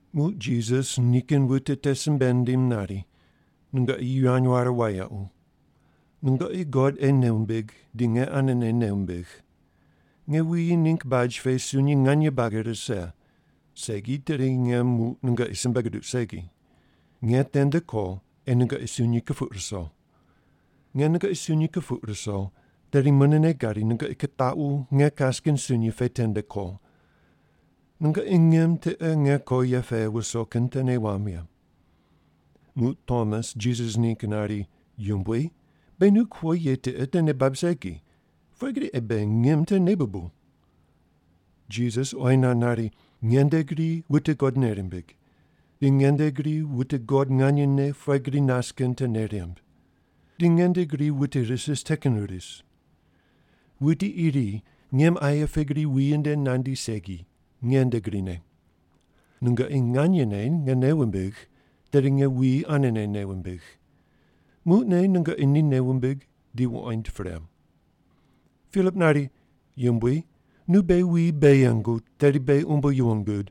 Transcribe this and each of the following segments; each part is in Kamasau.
Muq Jisas nikin wute te simbe nindim nari, “Nungoqi yivany ware wayequ. Nungoqi God ei nei wumbig di nge anene nei wumbigh. Nge wuyi ningg baj pe sunyi nganye buagi rise, segi tedi nge muq nungoqi simbe guduq segi. Nge tende ko ei nungoqi sunyi kupuq ruso. Nge nungoqi sunyi kupuq ruso, tedi munene gadi nungoqi kitaqu nge kas kin sunyi pe tende ko. Nungoqi ngim tiqe nge ko ye pe wuso kin te nei wamb ye.” Muq Tomas Jisas ningg nari, “Yumbui, beghi nu kuo ye tiqe te nei bab segi. Pughe gri ei beghi ngim te nei bubuw?” Jisas oyi nand nari, “Nge nde gri wute God nei rimbig, di nge nde gri wute God nganyene pughe gri nas kin te nei rimb. Di nge nde gri wute ris ris te kin ris. Wuti iri ngim aye pe gri wuyi nde nandi segi, nge nde grine. Nungoqi nganyene nge nei wumbigh, tedi nge wuyi anene nei wumbig. Muqne nungoqi ni nei wumbig di wuqoind pre.” Pilip nari, “Yumbui, nu beghi wuyi bei yengu, tedi beghi umbo yuwon gud.”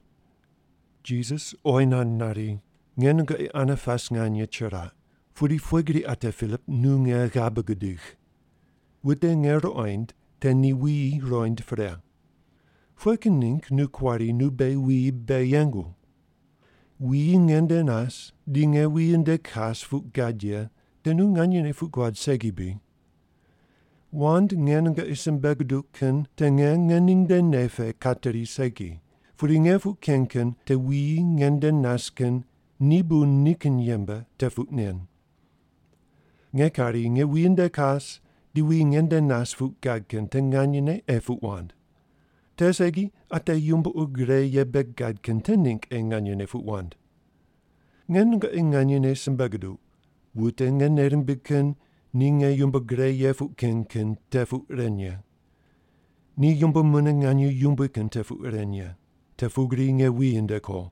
Jisas oyi nand nari, “Nge nungoqi ane pas nganye chiraq, pudi pughe gri ate Pilip nu nge ghabe gudigh? Wute nge ruqoind, te ni wuyi ruqoind pre. Pughe kin ningg nu kuari, ‘Nu beghi wuyi bei yengu’? Wuyi nge nde nas di nge wuyi nde kas puq gad ye te nu nganyene puq guad segi bri? Wand nge nungoqi simbe guduq kin te nge ngening nde nei pe kateri segi, pudi nge puq ken kin te wuyi nge nde nas kin ni bu nikin yembe te puq nen. Nge kari nge wuyi nde kas di wuyi nge nde nas puq gad kin te nganyene ei puq wand. Te segi ate yumbo ur gre ye bei gad kin te ningg ei nganyene puq wand. Nge nungoqi nganyene simbe guduq, wute nge nei rimbigh kin ni nge yumbo gre ye puq ken kin te puq ren ye. Ni yumbo mune nganye yumbui kin te puq ren ye, te pugri nge wuyi nde ko.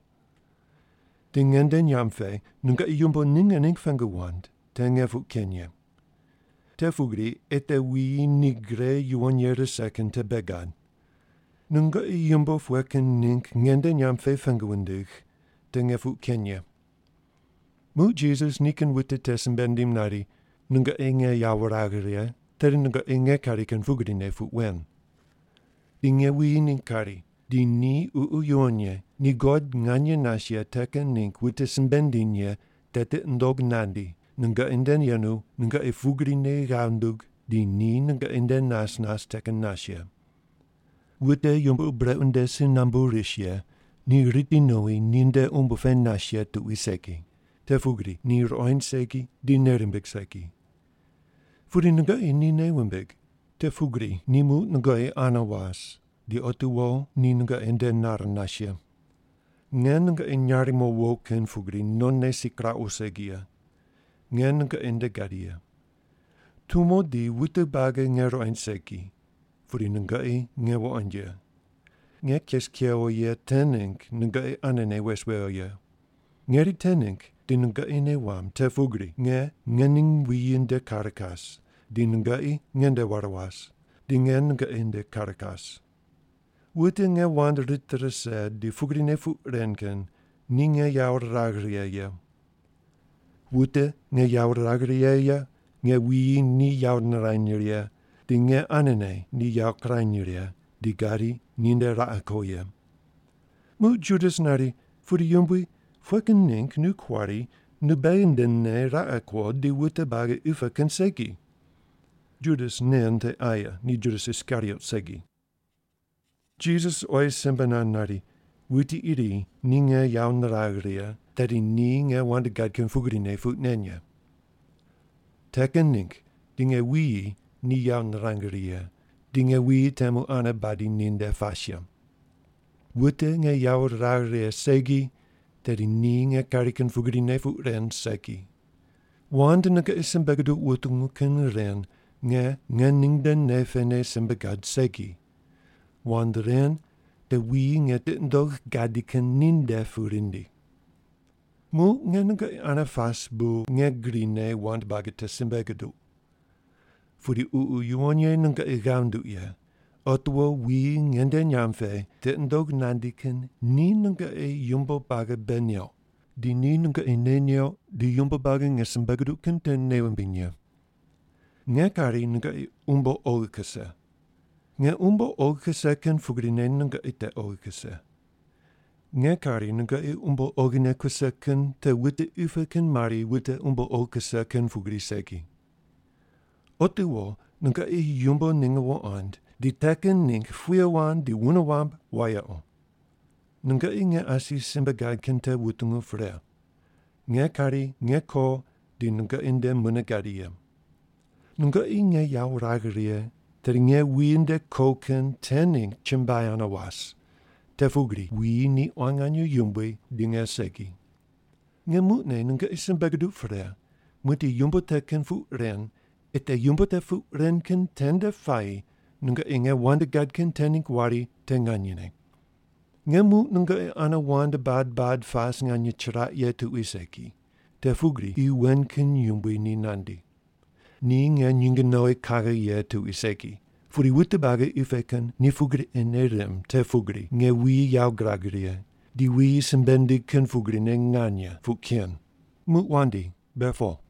Di nge nde nyamb pe nungoqi yumbo ninge ningg pengu wand, te nge puq ken ye. Te pugri ei te wuyi ni gre yuwon ye rise kin te bei gad. Nungoqi yumbo pughe kin ningg nge nde nyamb pe pengu wundigh, te nge puq ken ye.” Muq Jisas nikin wute te simbe nindim nari, “Nungoqi nge yawo wuragh righe, tedi nungoqi nge kari kin pugrine puq wen. Di nge wuyi ningg kari, di ni Ququ Yuwon Ye, ni God nganye nas ye te kin ningg wute simbe nindiny ye te tiqi nundog nandi, nungoqi nde yenu, nungoqi pugrine ghav nunduq, di ni nungoqi nde nas nas te kin nas ye. Wute yumbo ur brequ nde si nambu ris ye ni riti nowi ninde umbo pe nas ye tuqui segi, te pugri ni ruqoind segi di nei rimbig segi. Pudi nungoqi ni nei wumbig, te pugri ni muq nungoqi ane was di otiwo ni nungoqi nde nar nas ye. Nge nungoqi nyarimo wo kin pugri nonne si kiraqu segi ye. Nge nungoqi nde gadi ye. Tumo di wute buagi nge ruqoind segi, pudi nungoqi nge wuqoind ye. Nge kes kewo ye te ningg nungoqi anene wes wewo ye. Ngeri te ningg di nungoqi nei wamb te pugri nge ngening wuyi nde kar kas, di nungoqi nge nde war was, di nge nungoqi nde kar kas. Wute nge wand rit rise di pugrine puq ren kin ni nge yawo riragh righe ye. Wute nge yawo riragh righe ye, nge wuyi ni yawo nirany righe di nge anene ni yawo kirany righe, di gadi ni nde raqe ko ye.” Muq Judas nari, “Pudi Yumbui, pughe kin ningg nu kuari nu beghi ndene raqe kuo, di wute buagi qi pe kin segi?” (Judas nen te aye, ni Judas Iskariot segi.) Jisas oyi simbe nand nari, “Wuti iri ni nge yawo niragh righe, tedi ni nge wand gad kin pugrine puq nen ye. Te kin ningg di nge wuyi ni yawo nirang righe ye, di nge wuyi temu ane badi ninde pas ye. Wute nge yawo riragh righe segi, tedi ni nge kari kin pugrine puq ren segi. Wand nungoqi simbe guduq wutungu kin ren nge ngening nde nei pene simbe gad segi. Wand ren te wuyi nge tiqi nundogh gadi kin ninde pu rindi. “Muq nge nungoqi ane pas bu nge grine wand buagi te simbe guduq. Pudi Ququ Yuwon Ye nungoqi ghav nunduq ye, otiwo wuyi nge nde nyamb pe tiqi nundog nandi kin, ni nungoqi yumbo buagi bei neuq, di ni nungoqi nei neuq di yumbo buagi nge simbe guduq kin te nei wumbiny ye. Nge kari nungoqi umbo oghi kuse. Nge umbo oghi kuse kin pugrine nungoqi te oghi kuse. Nge kari nungoqi umbo oghine kuse kin te wute qi pe kin mari wute umbo oghi kuse kin pugri segi. Otiwo nungoqi yumbo ninge wuqond di te kin ningg puye wand di wune wamb wayequ. “Nungoqi nge asi simbe gad kin te wutungu pre, ‘Nge kari nge ko di nungoqi nde mune gadi ye.’ Nungoqi nge yawo wuragh righe, tedi nge wuyi nde ko kin te ningg chumbuai ane was, te pugri wuyi ni quan nganye yumbui di nge segi. Nge muqne nungoqi simbe guduq pre, muqdi yumbo te kin puq ren, ei te yumbo te puq ren kin tende puayi nungoqi nge wand gad kin te ningg wari te nganyene. Nge muq nungoqi ane wand bad bad pas nganye chiraq ye tuqui segi, te pugri qi wen kin yumbui ni nandi. Ni nge nyinge nowi kaghe ye tuqui segi, pudi wute buagi qi pe kin ni pugri ei nei rimb te pugri nge wuyi yawo girag righe, di wuyi simbe nindigh kin pugrine nganye puq ken. Muq wandi, be po.”